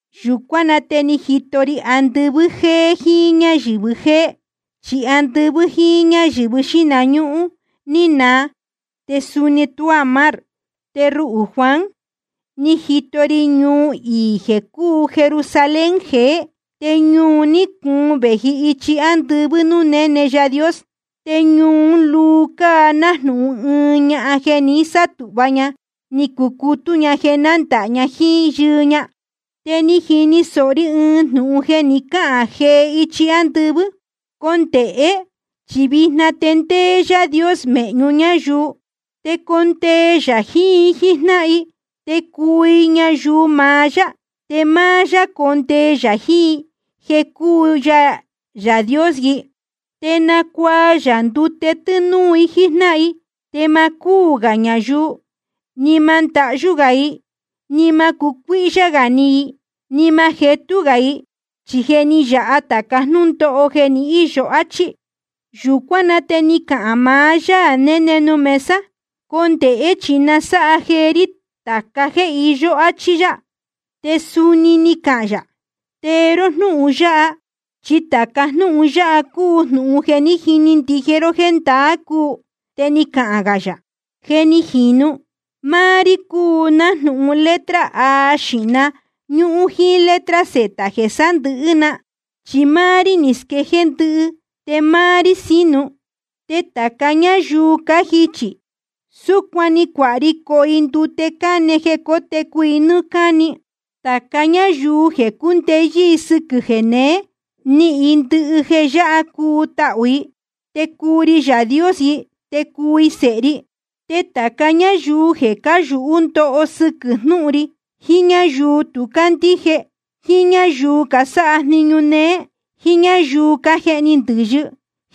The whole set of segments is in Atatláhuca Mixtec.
Yūcuán na te ni jito ri andɨvɨ́ jéé jíín ñáyɨ̄vɨ jéé. Chi andɨvɨ́ jíín ñáyɨ̄vɨ xíhna ñúhún ni naa. Te suni tuá mar. Te ruhū Juan, ni jito ri ñuu iī jeē cúu Jerusalén jeé. Te ñuu un ní cuun vēji ichi ándɨvɨ́ núū néne Yaā Dios. Te ñuu ún luu cáa nájnūhun ɨɨn ñahan jeē ni sátūhva ña ni cucutú ña jeē nándāha ña jíín yɨɨ ña. Te ni jini sōho ri ɨɨn jnūhun jeē ni cáhān jee ichi ándɨvɨ́: Condēhé, chi vijna te ndéé Yaā Dios mēhñu ñáyuu. Te condee yā jiín i jíjnáhan i, te cuu i ñayuu maá yá. Te máá yá condee yā jiín i jeē cúu ya Yaā Dios i. Te nacuaa yā ndute tɨ́núú i jíjnáhan i. Te ma cúū gā ñayuu, ni ma ndahyú gā i, ni ma cucuíhyá gā ni i, ni ma jetú gā i. Chi je ni yāha tāca jnúndóho jeē ni íyo, áchí. Yūcuán na te ni cahān maá Yaā néne nuū mesa: Condēhé, chi nasáha jeé rí tāca jéē iyó, áchí yá. Te suni ni cahān yā: Tee ró jnúhun yáha. Chi tāca jnúhun yáha cúu jnūhun jeē jiní ndije ró jéē ndaā cúu. Te ni cahān gā yā: Je ni jīnu. Máá rí cúu nájnūhun letra A xīhna ñúhún jíín letra Z jeē sándɨ̄hɨ́ na, chi máá rí ni squejéé ndɨhɨ te máá rí sínu. Te tāca ñáyuu cájichī, súcuan‑ni cuāha ri coho i ndute cáne jeē cótecu i nɨ́ɨ́ cáni. Tāca ñáyuu jeē cúndeyɨ́ sɨ́quɨ̄ jéneé, nihīn i ndɨhɨ jeē yáha cuu tahū i. Te cuu ri Yaā Dios i, te cuu i sēhe ri. Te tāca ñáyuu jeē cáyūhú ndoho sɨquɨ̄ jnúhun ri, jiín ñáyuu tu cácandíje, jíín ñáyuu casáha jniñu néé, jíín ñáyuu cájehni ndɨ̄yɨ,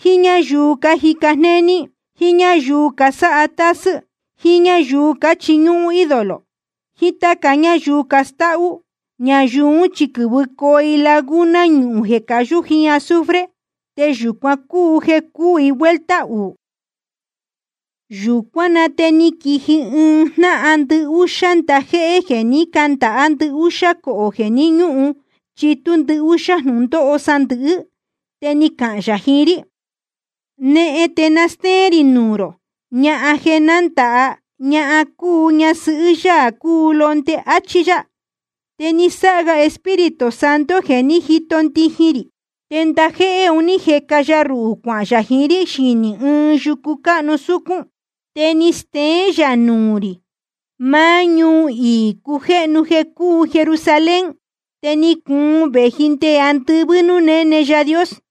jíín ñáyuu cájica jnéní, jíín ñáyuu casáha tásɨ́, jíín ñáyuu cáchiñúhún ídolo, jiín táca ñáyuu castáhú, ñayuu ún chi quɨ̄vɨcoo i laguna ñuhūn jeē cayú jíín azufre. Te yūcuan cúu jeē cúū i vuelta uū. Yūcuán na te ni quiji ɨɨn jnáhan ndɨhúxá ndajéhé jeē ní candāhá ndɨhúxá cohō jeē ni ñúhun chitú ndɨhúxá jnūndóho sandɨ̄hɨ́. Te ni cahān yā jiín rí: Nehen, te na stéén rī nuū rō ñahan jeē nándāha ña cuu ña ñasɨhɨ́ Yaā cúu Londe, áchí yá. Te ni sáha ga Espíritu Santo jeē ní jito ndijin rī, te ndajéhé un ní jeca ya ruhū cuahān yā jiín rí xinī ɨɨn yucu cáhnu súcún. Te ni steén yā nuū rī maá ñuu iī cujéhnu jeē cúu Jerusalén, te ni cuun vēji nde andɨvɨ́ núū néne Yaā Dios.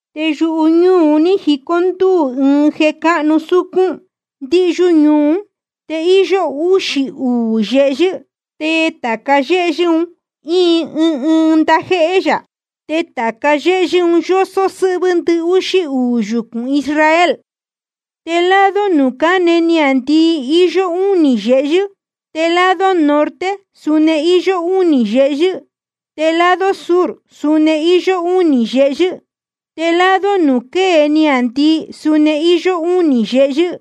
Te yuhu ñúū un ní jicó ndúū ɨɨn jeē cáhnu súcún ndíhyú ñuu ún. Te íyó úxī uū yehyɨ́. Te tāca yéhyɨ́ un íin ɨɨn ndajéhé yā. Te tāca yéhyɨ́ un yósó sɨ́hvɨ́ ndɨhúxí uū yucūn Israel. Te lado nuū cáne niāndii iyó únī yehyɨ́. Te lado norte suni íyó únī yehyɨ́. Te lado sur suni íyó únī yehyɨ́. Te lado nuū quée niāndii suni íyó únī yehyɨ́.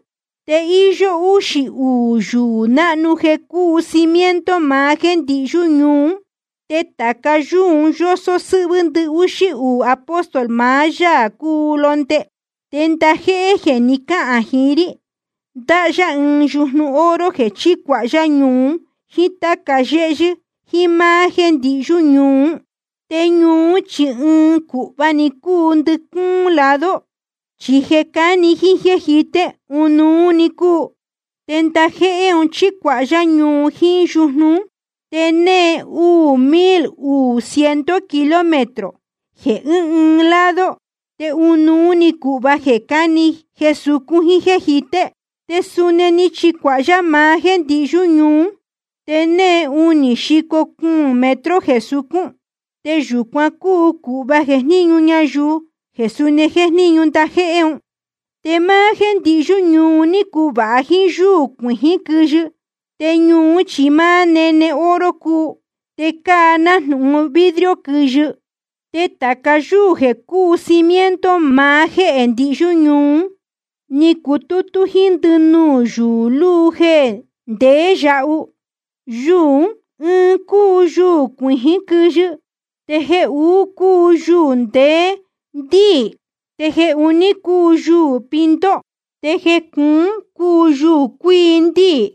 Te íyó úxī uū yuū náhnu jeē cúu cimiento maá jéē ndihyú ñuu ún. Te tāca yúū un yósó sɨ́hvɨ́ ndɨhúxí uū apóstol maá Yaā cúu Londe. Te ndajéhé jeē ni cáhān jiín rí, ndáhá yá ɨɨn yujnu oro jeē chícuāha yá ñuu un jíín táca yéhyɨ́ jiín máá jéē ndihyú ñuu ún. Te ñuu ún chi ɨɨn cūhva‑ni cúu ndɨcúún lado. Chi jeē cáni jíín jéē jité, ɨnuú‑ni cúu. Te ndajéhé un ní chicuāha yá ñuu un jíín yujnu ún. Te née uū mil uū ciento kilómetro jeē ɨ́ɨn ɨɨn lado. Te ɨnuú‑ni cūhva jeē cáni, jeē sucún, jíín jéē jité. Te suni ni chicuāha yá maá jéē ndihyú ñuu ún, te née unī xico cuūn metro jeē sucún. Te yūcuan cúu cūhva jejníñu ñayuu, jeē suni jéjníñu ndajéhé un. Te máá jéē ndihyú ñuu un ní cuvāha jíín yúū cuijín quɨyɨ. Te ñuu ún chi máá nene oro cúu, te cáa nájnūhun vidrio quɨyɨ. Te tāca yúū jeē cúu cimiento maá jéē ndihyú ñuu ún, ní cucutú jíín ndɨnuū yuū luu jeē ndeé yahu. Yuū ɨɨn cúu yuū cuijín quɨyɨ. Te jeē uú cúu yuū ndeé ndíī. Te jeē uní cúu yuū pinto. Te jeē cuún cúu yuū cuíi ndíī.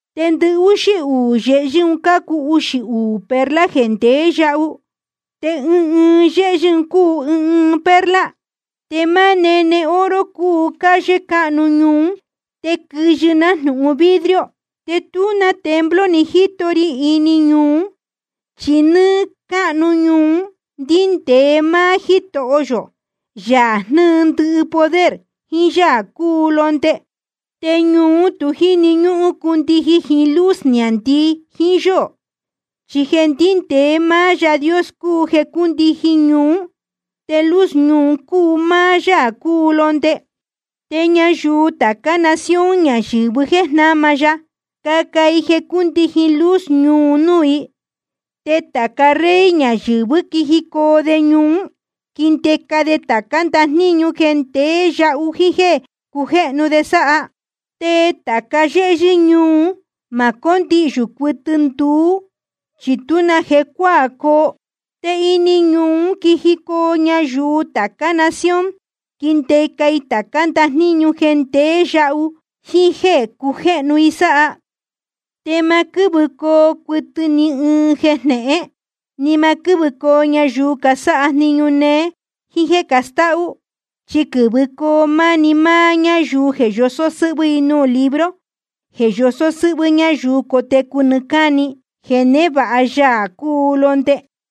Te ndɨhúxí uū yehyɨ́ un cácuu uxī uū perla jeē ndeé yahu. Te ɨɨn ɨɨn yéhyɨ́ cúu ɨɨn ɨɨn perla. Te máá nene oro cúu calle cáhnu ñuu ún, te quɨyɨ nájnūhun vidrio. Te tú na templo ni jíto ri ini ñuu ún, chi nɨ́ɨ́ cáhnu ñuu un ndéé máá Jítoho yō, Yaā jnɨ́ɨ ndɨhɨ poder, jiín Yaā cúu Londe. Te ñuu ún tu jíni ñúhún cundijin jiín luz niāndii jiín yóō. Chi jeē ndíndēe máá Yaā Dios cúu jeē cúndijin ñuu ún. Te luz ñuu un cúu máá Yaā cúu Londe. Te ñayuu tācá nación ñayɨ̄vɨ jéē ní jnama ya, caca i jeē cúndijin luz ñuu un núū i. Te tāca rey ñayɨ̄vɨ́ quijicoo de ñuu ún, quindeca de tācá ndajníñu jeē ndeé yahu jíín jéē cujéhnu de sáha. Te tāca yéhyɨ́ ñuu ún ma cóndihyū cuɨtɨ nduú, chi tú na jecuáā coo. Te ini ñuu ún quijicoo ñayuu tācá nación, quindeca i tācá ndajníñu jeē ndeé yahu jíín jéē cujéhnu i sáha. Te ma quɨ́vɨcoo cuɨtɨ ni ɨɨn jeē jnehén. Ni ma quɨ́vɨcoo ñayuu casáha jniñu néé jíín jéē castáhú. Chi quɨ̄vɨcoo máni máá ñáyuu jeē yosó sɨ́hvɨ́ i nuū libro jeē yosó sɨ́hvɨ́ ñáyuu cotecu nɨɨ́ cáni, jeē névāha Yaā cúu Londe.